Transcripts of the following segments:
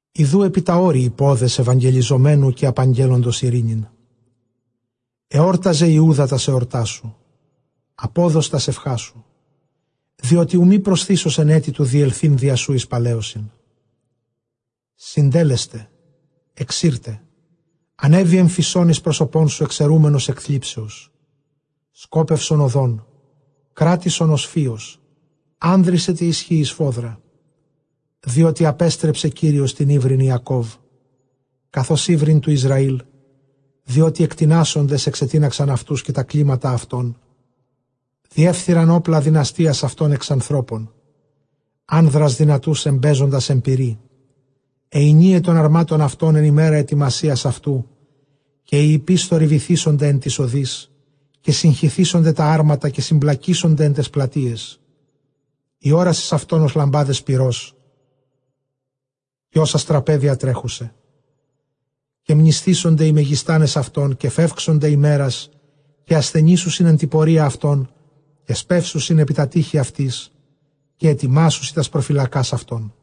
Ἰδοὺ ἐπὶ τὰ ὄρη οἱ πόδες εὐαγγελιζομένου, καὶ ἀπαγγέλλοντος εἰρήνην· ἑόρταζε Ἰούδα τὰς ἑορτάς σου, ἀπόδος τὰς εὐχάς σου, διότι οὐ μὴ προσθήσωσιν ἔτι τοῦ διελθεῖν διὰ σοῦ εἰς παλαίωσιν. Συντετέλεσται, ἐξῇρται· ἀνέβη ἐμφυσῶν εἰς πρόσωπόν σου, ἐξαιρούμενος ἐκ θλίψεως· σκόπευσον ὁδὸν, κράτησον ὀσφύος, ἄνδρισαι τῇ ἰσχύϊ σφόδρα. Διότι ἀπέστρεψε Κύριος τὴν ὕβριν Ἰακὼβ, καθὼς ὕβριν τοῦ Ἰσραὴλ, διότι ἐκτινάσσοντες ἐξετίναξαν αὐτοὺς, καὶ τὰ κλήματα αὐτῶν διέφθειραν. Ὅπλα δυναστείας αὐτῶν ἐξ ἀνθρώπων, ἄνδρας δυνατοὺς ἐμπαίζοντας ἐν πυρί· αἱ ἡνίαι τῶν ἁρμάτων αὐτῶν ἐν ἡμέρᾳ ἑτοιμασίας αὐτοῦ, καὶ οἱ ἱππεῖς θορυβηθήσονται ἐν ταῖς ὁδοῖς, καὶ συγχυθήσονται τὰ ἅρματα, καὶ συμπλακήσονται ἐν ταῖς πλατείαις· ἡ ὅρασις αὐτῶν ὡς λαμπάδες πυρὸς, καὶ ὡς ἀστραπαὶ διατρέχουσαι. Καὶ μνησθήσονται οἱ μεγιστᾶνες αὐτῶν, καὶ φεύξονται ἡμέρας, καὶ ἀσθενήσουσιν ἐν τῇ πορείᾳ αὐτῶν, καὶ σπεύσουσιν ἐπὶ τὰ τείχη αὐτῆς, καὶ ἑτοιμάσουσι τὰς προφυλακὰς αὐτῶν.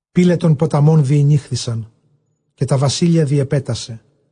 Πύλαι τῶν πόλεων διηνοίχθησαν, καὶ τὰ βασίλεια διέπεσε,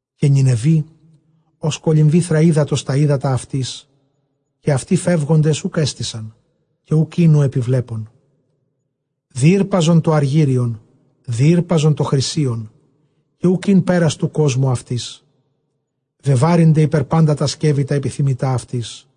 Καὶ Νινευὴ ὡς κολυμβήθρα ὕδατος τὰ ὕδατα αὐτῆς, καὶ αὐτοὶ φεύγοντες οὐκ ἔστησαν, καὶ οὐκ ἦν ὁ ἐπιβλέπων. Διήρπαζον τὸ ἀργύριον, διήρπαζον τὸ χρυσίον, καὶ οὐκ ἦν πέρας τοῦ κόσμου αὐτῆς· βεβάρυνται ἐπὶ πάντα τὰ σκεὺη τὰ ἐπιθυμητὰ αὐτῆς.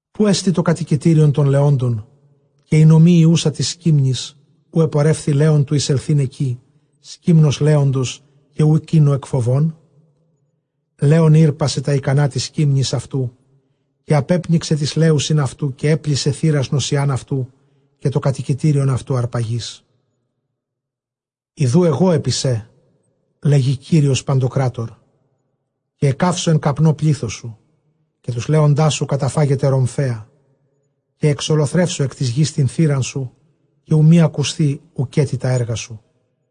Ποῦ ἐστι τὸ κατοικητήριον τῶν λεόντων, καὶ ἡ νομὴ ἡ οὖσα τοῖς σκύμνοις; ποῦ ἐπορεύθη λέων, τοῦ εἰσελθεῖν ἐκεῖ σκύμνον λέοντος, καὶ οὐκ ἦν ὁ ἐκφοβῶν; Λέων ἥρπασε τὰ ἱκανὰ τοῖς σκύμνοις αὐτοῦ, καὶ ἀπέπνιξε τοῖς λέουσιν αὐτοῦ, καὶ ἔπλησε θήρας νοσσιὰν αὐτοῦ, καὶ τὸ κατοικητήριον αὐτοῦ ἁρπαγῆς. Ἰδοὺ ἐγὼ ἐπὶ σὲ, λέγει Κύριος παντοκράτωρ, καὶ ἐκκαύσω ἐν καπνῷ πλῆθός σου, καὶ τοὺς λέοντάς σου καταφάγεται ῥομφαία, καὶ ἐξολοθρεύσω ἐκ τῆς γῆς τὴν θήραν σου, καὶ οὐ μὴ ἀκουσθῇ οὐκέτι τὰ ἔργα σου.